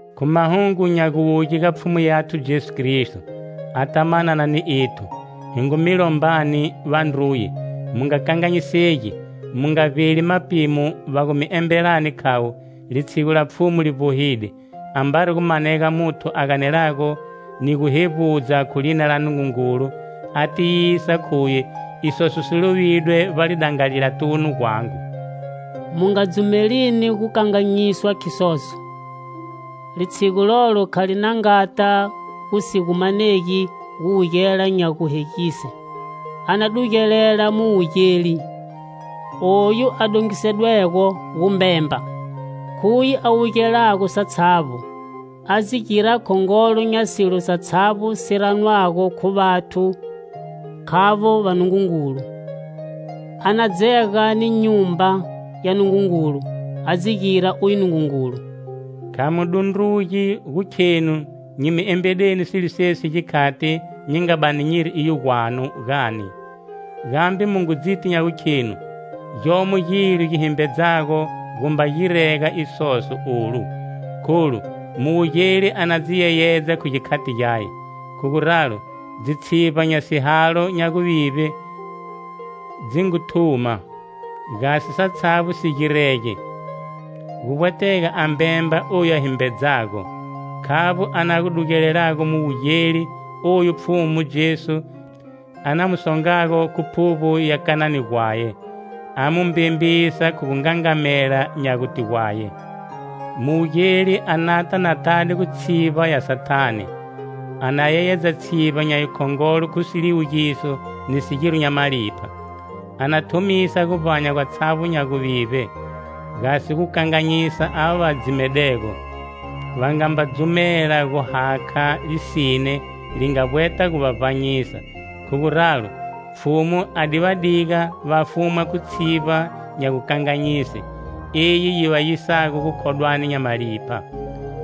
Khu mahungu nya guwuye ga Pfhumu yathu Jesu Kristo, ata manana ni ethu, hi ngu mi lombani, vandruye, mu nga kanganyisegi, mu nga vbeli mapimo va gu mi embelani khavo, litshigu la Pfhumu li vbohile. Ambari a gumanega muthu a ganela ni gu hevbudza khu lina la Nungungulu a tiyisa khuye isoso si lovidwe vbalidangalilatunu gwangu, mu nga dzumelini gukanganyiswa khisoso. Litshigu lolo kha li na ngata gu si gu manegi guwugela nya guhegise; a na dugelela muwugeli, oyu a dongisedwego gumbemba. Khuye a wugelago satshavbo, a dzi gira khongolo nya silo satshavbo si ranwago khu vathu khavo vanungungulu. A na dzega ni nyumba ya Nungungulu, a dzi gira uye nungungulu. Kha mu dundrugi gu khenu nyi mi embedeni silo sesi gikhati nyi nga bani nyiri iyo gwanu, gani? Gambe mu ngu dziti nya gukhenu gyomo gilo gi himbedzago gumba girega isoso olu. Kholu muwugeli a na dzi yeyedza khu gikhati gyaye. Khu guralo dzitshivba nya sihalo nya guvivbe dzi ngu thuma. Gasi satshavbo si girege, gu vbwetega a mbemba oyu a himbedzago. Khavbo a na gu dugelelago muwugeli oyu Pfhumu Jesu a na mu songago khu phuvbo ya kanani gwaye. A mu mbembisa khu gungangamela nya gute gwaye. Muwugeli a nata na tade khu tshivba ya Sathane, a na yeyedza tshivba nya yikhongolo khu siliwugiso ni sigiro nya malipha. A na thumisa guvbanya gwatshavbo nya guvivbe, gasi gu kanganyisa ava va dzimedego, va nga mba dzumela gu hakha lisine li nga vbweta gu va vbanyisa. Khu guralo, Pfhumu a di va diga va fumwa khu tshivba nya gukanganyise, eyi yi va yisago gukhodwani nya malipha.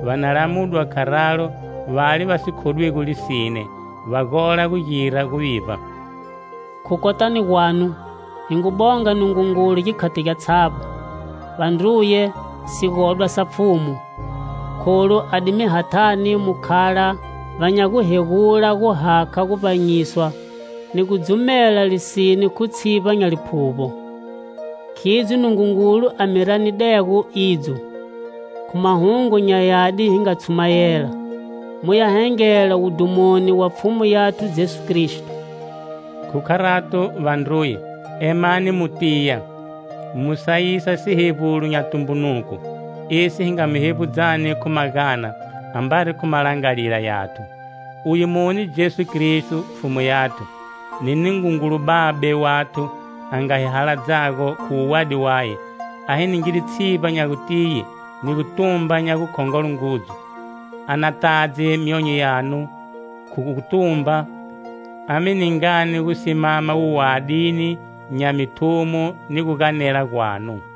Va na lamudwa kharalo vale va si khodwigo lisine, va gola gu gira guvivba. Khu kotani gwanu, hi ngu bonga Nungungulu gikhati gyatshavbo, vandruye, sigodwa sa Pfhumu, kholu a di mi hathani mu khala va nya guhegula gu hakha guvbanyiswa ni gu dzumela lisine khu tshivba nya Liphuvbo. Khidzo Nungungulu a mi ranedego idzo, khu Mahungu nya Yadi hi nga tshumayela, mu ya hengela wudhumoni wa Pfhumu yathu Jesu Kristo. Khu kharato, vandruye, emani mu tiya, mu sayisa sihevbulo nya tumbunuko, esi hi nga mi hevbudzani khu magana, ambari khu malangalila yathu. Uye mune Jesu Kristo, Pfhumu yathu, ni Nungungulu Babe wathu a nga hi haladzago, khu wuwadi waye, a hi ningide tshivba nya gutiye, ni gutumba nya gukhongolo ngudzu. A na tadze myonyo yanu khu gutumba, a mi ningani gu simama wuwadini nya mithumo ni guganela gwanu.